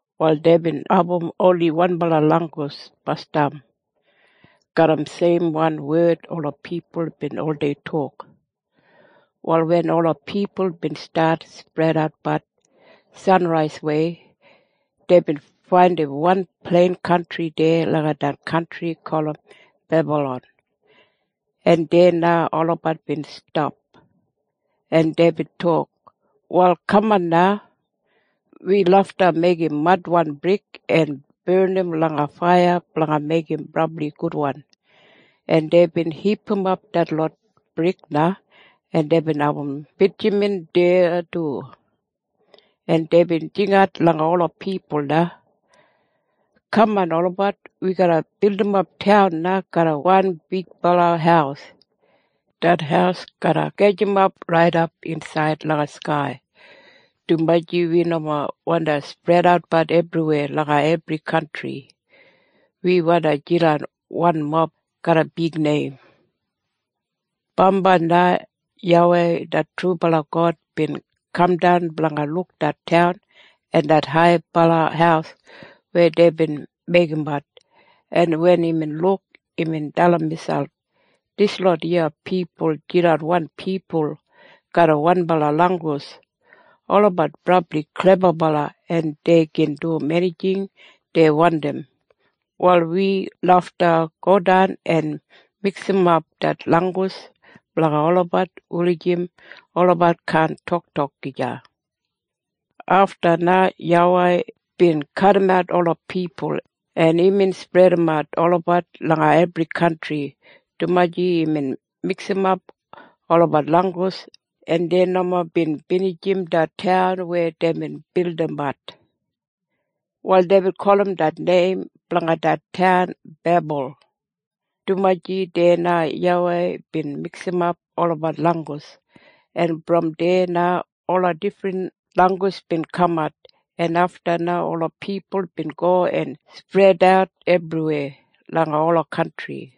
Wal deibin abum oni wanbala langgus basdam. Garram seimwan wed ola pipul bin oldei tok. Wal wen ola pipul bin stat spredatbat sanraiswei, deibin faindim wan plein kantri deya langa det kantri gulum Bebalon, en deya na olabat bin stap, en deibin tok, “Wal kaman na. Wi lafta meigim madwan brik en barnim langa faiya blanga meigim brabli gudwan.” En deibin hipimap detlot brik na, en deibin abum bitjaman deya du, en deibin jingat langa ola pipul na, “Kaman olabat! Wi garra bildimap taun na garram wan bigbala haus. Det haus garra gajimap raidap insaid langa skai, dumaji wi nomo wandi spredatbat ebriweya langa ebri kantri. Wi wandi jidan wanmob garram bigneim.” Bambai na YAWEI det trubala God bin kamdan blanga luk det taun en det haibala haus weya deibin meigimbat, en wen imbin luk, imbin dalim miselp, “Dislot iya pipul jidan wan pipul garram wanbala langgus. Olabat brabli klebabala, en dei gin dum enijing dei wandim. Wal wi lafta godan en miksimap det langgus blanga olabat wulijim olabat kaan toktok gija.” Afta na YAWEI bin kadimat ola pipul, en imbin spredimat olabat langa ebri kantri, dumaji imbin miksimap olabat langgus, en dei nomo bin binijim det taun weya deibin bildimbat. Wal deibin gulum neim blanga det taun Bebul, dumaji deya na YAWEI bin miksimap olabat langgus, en brom deya na ola difrin langgus bin kamat, en afta na ola pipul bin go en spredat ebriweya langa ola kantri.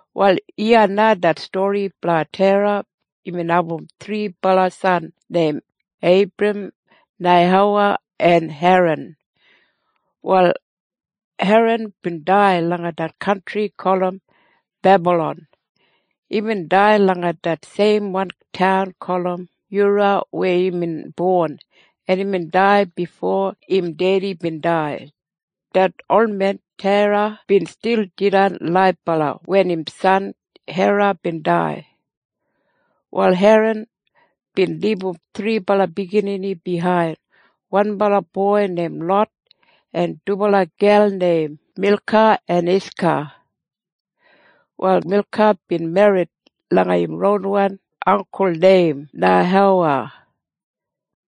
Wal iya na det stori blanga Tera. Imbin abum thribala san neim Eibram, Neihowa en Heran. Wal Heran bin dai langa det kantri gulum Bebalon. Imbin dai langa det seimwan taun gulum Yura weya imbin bon, en imbin dai bifo im dedi bin dai. Det olmen Tera bin stil jidan laibala wen im san Heran bin dai. Wal Heran bin libum thribala biginini biyain, wanbala boi neim Lot en dubala gel neim Milka en Iska. Wal Milka bin merrit langa im ronwan anggul neim Neihowa.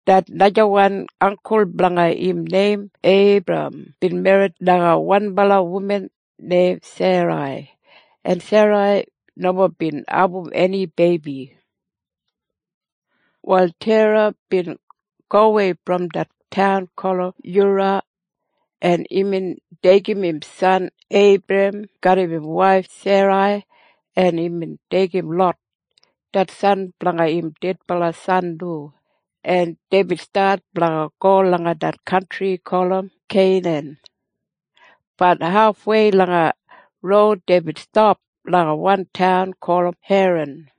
Det najawan anggul blanga im neim Eibram bin merrit langa wan wuman neim Serai, en Serai nomo bin abum eni beibi. Wal Tera bin gowei brom det taun gulum Yura, en imbin deigim im san Eibram garram im waif Serai, en imbin deigim Lot, det san blanga im dedbala san du, en deibin stat blanga go langa det kantri gulum Keinan. Bat hafwei langa roud deibin stap langa wan taun gulum Heran.